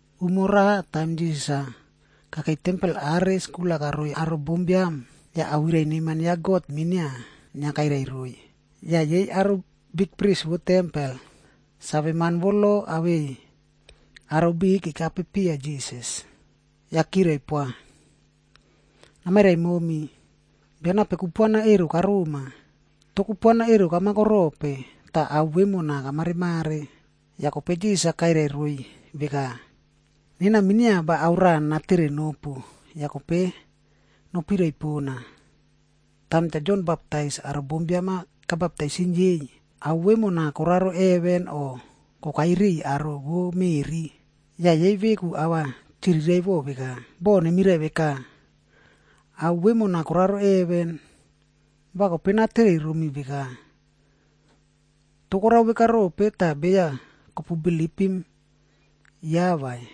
Umo raꞌa, taim Jisas-a kakei tempel are skul-a karao roiy aro bombiam, yah awirai neman ya God minia inia kairai roiy. Yah yei aro bikpris vo tempel, saveman vo lo awei aro biꞌiy kekape piya Jisas. Yah kirai poa, “Namairai momi, bia nape kupuana ero karoma? Toh kupuana ero kamako rope, tah ao vemona kamareꞌmare?” Yah kope Jisas-a kairai roiy veka, “Nena minia va ao raꞌa nana tere nopu, yah kope nopirai pona. Taim Cha Jon Baptais aro bombiam-a kabaptaisim yei, ao vemona koraro heven o kokai riꞌiy aro vo meꞌri?” Yah yei veku ava chiriraiꞌvo veka, “Boh nemirai veka, ‘Ao vemona koraro heven,’ va kope natere romi veka, ‘Toh korao veka rope tah beya kopu bilipim ya vai?’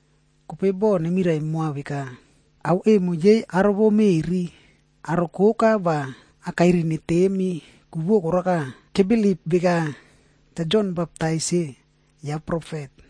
Kope boh nemirai moa veka, ‘Ao emo yei aro vo meꞌri,’ aro koka va akairi netemi, ku vo koraka, kebilip veka Cha Jon Baptais-e, ya profet.”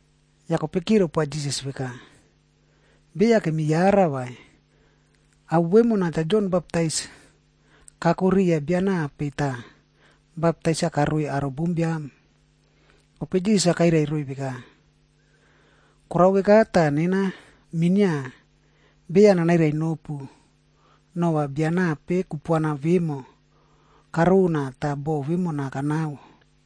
Yah kope kirai poa Jisas veka, “Beya kemi yara vai, ao vemona Cha Jon Baptais kako riya bia nape tah baptais-a karoi aro bombiam.” Kope Jisas-a kairai roiy veka, “Korao veka tah nena minia beya nanairai nopu nova bia nape kupuana vemo karona tah boꞌo vemona kanao.”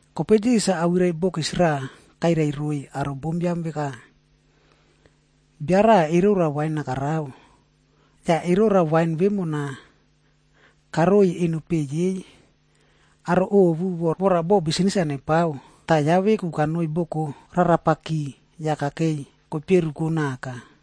Kope Jisas-a awirai bokis raꞌa kairai roiy aro bombiam veka, “Bia raꞌa erora wain-a karao. Yah erora wain vemona karoiy eno peꞌe yei aro ovu vora boꞌo bisnis-a nepiapao, tah ya veku kanoi boko rarapaki yah kakei koiperuko naka.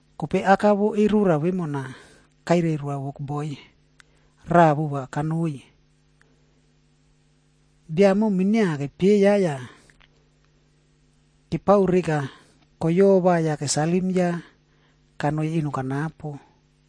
Kope aka vo erora vemona, kairai roa wokboi raꞌa vova kanoi. Bia emo minia kepieya yah kepao reka koyova yah kesalim ya kanoi eno kanapo.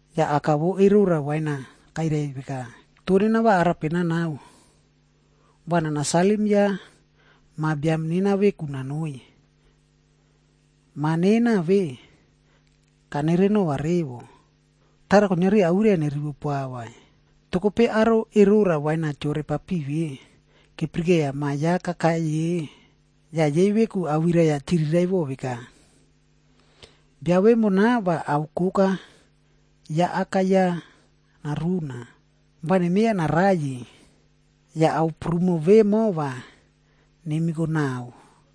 “Yah aka vo erora wain-a kairai veka, ‘Toh nena va arape nanao? Va nana salim ya ma biam nena veku nanoi. Ma nena ve, kanere nova revo. Tara kuiniari awirai-a nerivo poa vai.’ “Toh kope aro erora wain-a keore papiꞌi ve, kepirikeiya ma ya kakai ye yah yei veku awirai-a chiriraiꞌvo veka, ‘Bia vemona va ao koka ya aka ya naruna. Va nemieya naraiyi, yah ao prumo vemo va nemiko naꞌao.’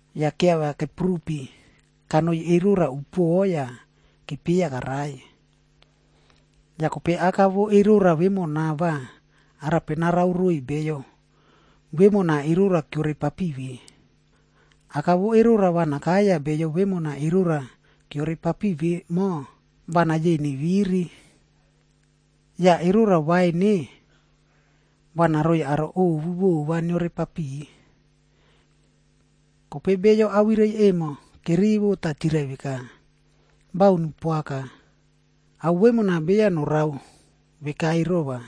Yah keavia kepurupi kanoi erora upuoꞌo yah kepieya karai. “Yah kope aka vo erora vemona va arape narao roiy beyo vemona erora keore papiꞌi ve? Aka vo erora va nakai yah beyo vemona erora keore papiꞌi vemo va nayeiy neviri. Yah erora wain-e, va naroiy aro ovu vova neore papiꞌi.” Kope beyo awirai emo kerivo tah chirai veka, “Baun poaka! Ao vemona beya norao veka ero vai.”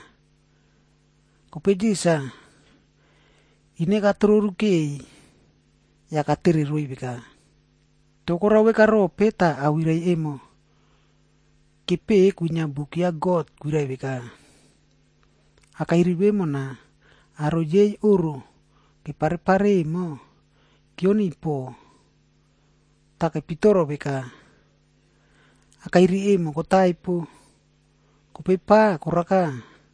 Kope Jisas-a ine katororu keꞌeiy yah katere roiy veka, “Toh korao vekarope tah awirai emo kepeꞌe kwinia buk ya God kwirai veka, ‘Akairi vemona, aro yei oꞌro kepare pare emo, keoniy poꞌo tah kepitoro veka, akairi emo kotaipo, kope pa, koraka,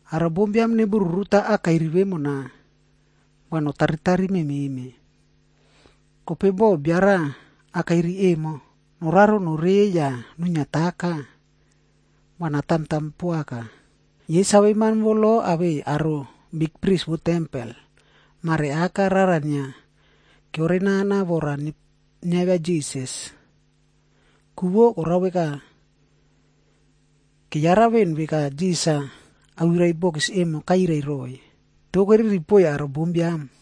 Aro bombiam nebururuta akairi vemona, va netaritari mememe. Kope boh bio raꞌa akairi emo noraro norei yah nuiniataka, va natamtam poaka.” Yei saveman vo lo awei aro bikpris vo tempel, mare aka rara inia keore nana vora niavia Jisas. Ku vo karao veka, keyara veꞌen veka Jisas-a awirai bokis emo kairai roiy. Toh keriri poiy aro bombiam.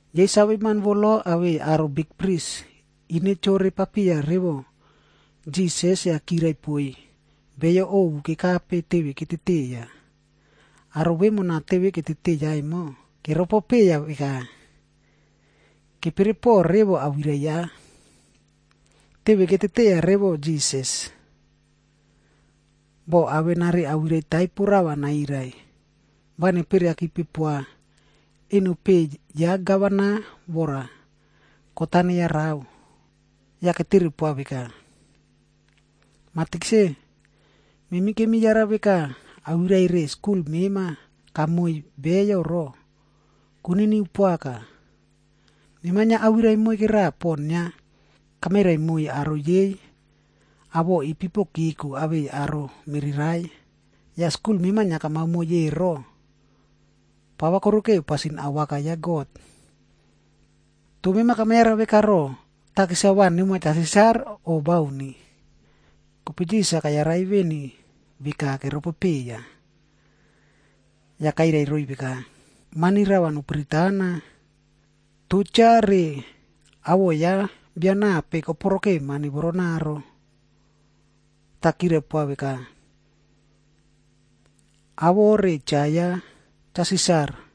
Yei saveman vo lo awei aro bikpris ine chore papiya revo Jisas yah kirai poiy beyo ovu kekape teve keteteiya. Aro vemona teve keteteiya emo, keropo peiya veka, kepere poꞌo revo awirai ya. Teve keteteiya revo Jisas, boh avenari awirai taipo rava nairai, va neperiakipe poa eno peꞌe ya gavana vora kot-a neyarao. Yah ketere poa veka, “Mah Tikse, memi kemi yara veka awirai re skul mema kamoiy beyo ro, koniniu poaka. Mema inia awirai moike raꞌa pon inia kamairai moiy aro yei awoꞌo ipipo keko awei aro mererai. Yah skul mema inia kamao moiy ero, pava korikeu pasin awaka ya God. Toh mema kama yara veka roꞌo, takis-a va nemoa Cha Sisar o bauni?” Kope Jisas kayarai veni veka keropo peiya. Yah kairai roiy veka, “Mani rava nopiritana. Toh cha re awoꞌo ya bia nape koporoke mani voronaro?” Yah kirai poa veka, “Awoꞌo re cha ya Cha Sisar.”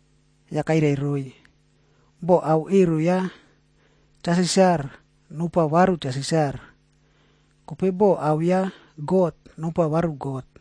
Yah kairai roiy, “Boh ao ero ya Cha Sisar, nopoa varu Cha Sisar. Kope boh ao ya God, nopoa God.”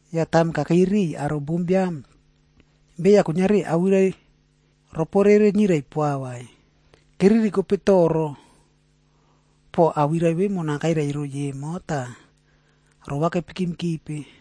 Yah taim kakei riꞌiy aro bombiam, beya kuiniari awirai roporere nirai poa vai. Keririkope toro poꞌo awirai vemona kairai roiy emo, tah rova kepikimkipe.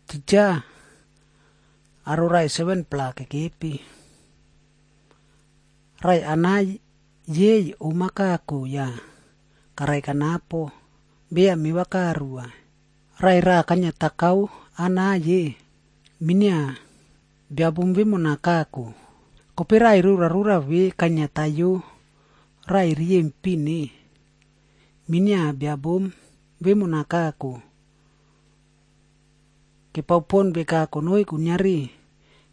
Titja, aro raꞌai 7-pla kekepi. Raꞌai anai yei om-a kako yah karai kanapo, beya meva karu vai. Raꞌai raꞌa kainia takao anai ye, minia bia bom vemona kako. Kope raꞌai rorarora ve kainiataiyo raꞌai riyempin-e, minia bia bom vemona kako. Kepao pon veka konoi kuiniari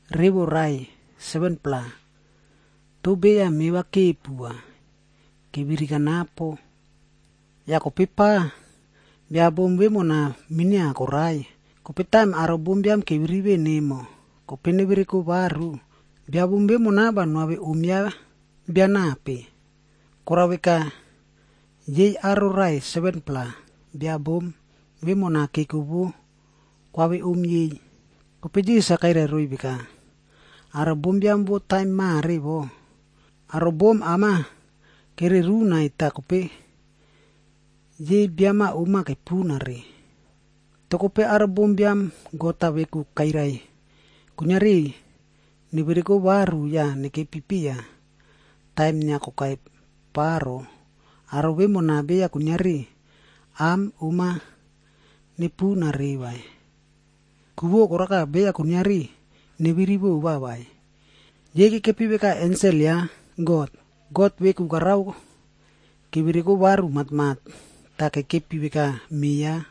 revo raꞌai 7-pla, toh beya meva kepu vai, keviri kanapo. Yah kope pa, bia bom vemona minia korai. Kope taim aro bombiam keviri veꞌen emo, kope nevereko varu, bia bom vemona va noave om ya bia nape?” Korao veka, yei aro raꞌai 7-pla, bia bom vemona keko vo koave om yei. Kope Jisas-a kairai roiy veka, “Aro bombiam vo taim mare wo, aro bom am-a kererunaiy tah kope yei biam-a om kepunare. Toh kope aro bombiam God-a veku kairai kuiniari nevereko varu yah nekepi piya taim inia kokai pa ro, aro vemona beya kuiniari am om-a nepunare vai. Ku vo koraka beya kuiniari neviri vova vai. Yei kekepi veka ensel ya God. God-a veku karao kevereko varu matmat, tah kekepi veka me ya.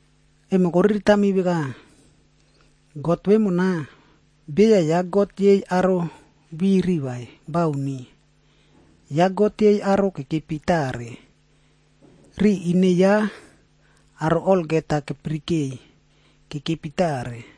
Emo koriritami veka, God vemona, beya ya God yei aro viri vai, bauni. Ya God yei aro kekepi tare. Ri ine ya, aro olgeta kapirikeiy kekepi tare.”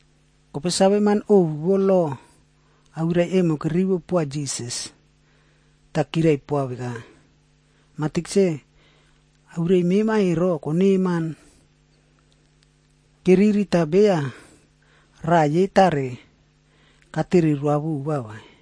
Kope saveman ovu vo lo awirai emo kerivo poa Jisas, tah kirai poa veka, “Mah Tikse, awirai mema ero, koneman.” Keriri tah beya raꞌa yei tare katere roa vova vai.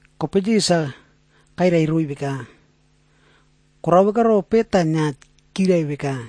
Kope Jisas-a kairai roiy veka, “Korao veka rope tah inia kirai veka,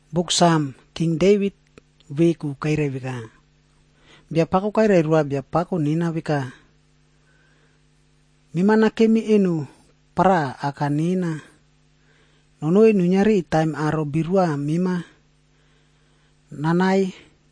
Buk Sam, King Devit veku kairai veka, ‘Biapako kairai roa Biapako nena veka, “Mema nakemi eno paraꞌa awaka nena, nonoi nuiniari taim aro birua mema nanaiy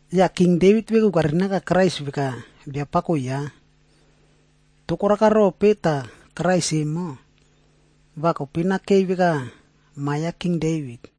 Yah King Devit veku kairinaka Krais veka ‘Biapako’ ya. Toh koraka rope tah Krais emo, va kope nakei veka ma ya King Devit?”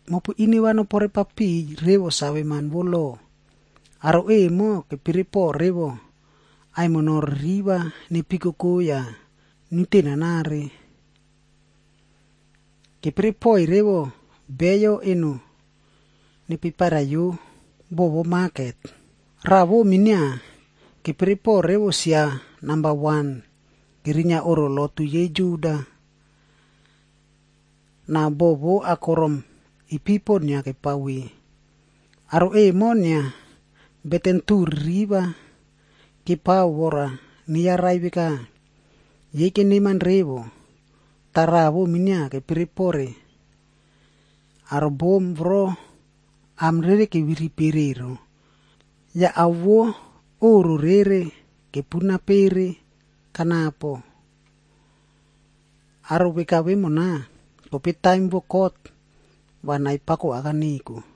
“Mopu ine nopore papiꞌiy revo saveman vo lo. Aro emo kepere poꞌo revo aimino ririvag nepikoko yah niute nanare. Kepere poiy revo beyo eno nepeparaiyo bo vo maket. Raꞌa vo minia, kepere poꞌo revo sia namba wan kerinia oꞌro lotu yei Juda, na bo vo akorom ipipo inia kepao ve. Aro emo, inia beten tuꞌu ririva kepao vora neyarai veka yei keneman revo, tah raꞌa minia keropopere aro bom voro am rere keviri pere ero, yah ao vo oꞌro rere kepuna pere kanapo. Aro veka vemona, kope taim vo kot, va nai pako aka neko.”